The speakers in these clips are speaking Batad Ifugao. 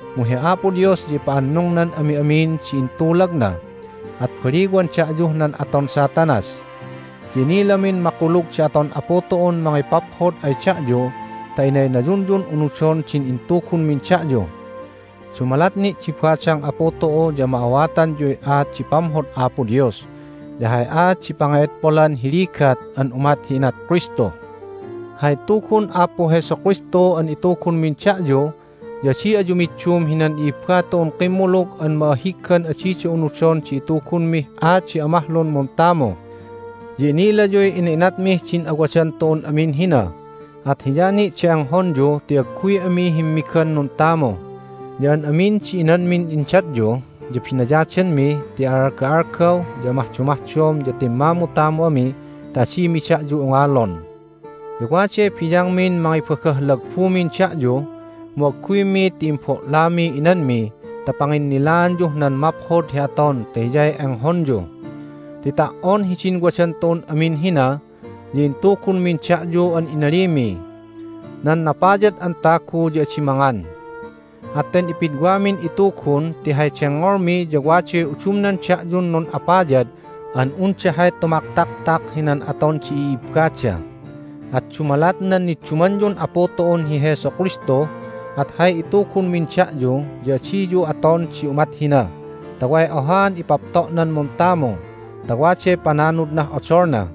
Mu hi Apo Dios ya ipa'annungnan ami'amin di intulagna, at baliwan da'yuh nan aton Satanas. Ya inilamin makulug di aton Apu tu'un mangipaphod ay da'yu ta inaynayunyun unudon din intugunmin da'yu. Dumalat ni' di badang Apu tu'u ya ma'awatanyuy aat di pamhod Apo Dios ya hay aat di pange'edpolan hi ligat an umat hi inat Kristu. Hay tugun Apu Jesu Kristu an itugunmin da'yu ya adi ayu middum hinan i'ibba tu'un kimmulug an ma'ahiggan adida unudon di itugunmih aat di amahlun muntamu. Ya inilayuy ina'inatmih din awadan tu'un amin hina, at hiya ni' di enghonyu ti agguy ami himmigan nuntamu, ya an amin di inanmin indatyu ya binayadanmi ti a'alga'algaw ya amahdomahdom ya timmamutamu ami ta adimi da'yu ungalon. Ya waday biyangmin mangibagah lagbumin da'yu, mu agguymi ti imbo'lamiy inanmi ta panginnilaanyuh nan maphod hi aton ta hiyay enghonyu. Ti ta"on hidin wadan tu'un amin hina ya intugunmin da'yu an inalimiy, "Nan napayad an tagu ya adi mangan." At ten ipidwamin itugun ti hay dengngolmi ya waday udumnan da'yun nun'apayad an unda hay tumaktaktak hinan aton di i'ibbada. At dumalat nan niddumanyun Apu tu'un hi Jesu Kristu at hay itugunmin da'yu ya adiyu aton di umat hina ta way ohaan ipapto'nan muntamu ta waday pananudnah odolna.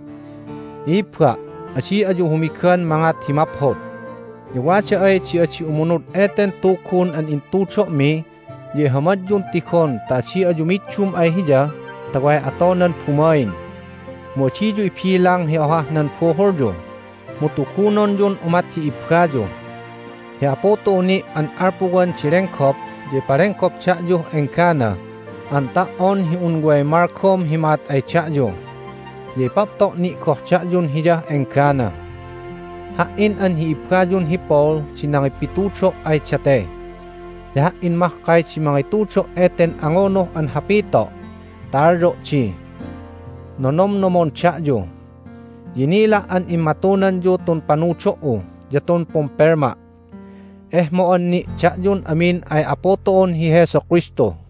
I'ibba', adi ayu humigan mangat hi maphod. Ya wada ay di adi umunud eten tugun an intudo'mi ya ihamadyun tigon ta adi ayu middum ay hiya ta way atonan bumain. Mu adiyu ibilang hi ohah nan buhulyu, mu tugunonyun umat hi ibbayu. Hi Apu tu'u ni' an alpuwan di lenggop ya ipalenggop da'yuh enggana an ta"on hi un way malgom hi ma'at ay da'yu. Ya ipapto' ni' goh da'yun Hiyah enggana. Ha"in an hi ibbayun hi Paul di nangipitudo' ay date, ya ha"in mahkay di mangitudo' eten angunuh an hapito' ta alyo' di, "Nonomnomon da'yu." Ya inila' an immatunanyu tun panudo"u ya tun pumpelma'. Ehmo'an ni' da'yun amin ay Apu tu'un hi Jesu Kristu.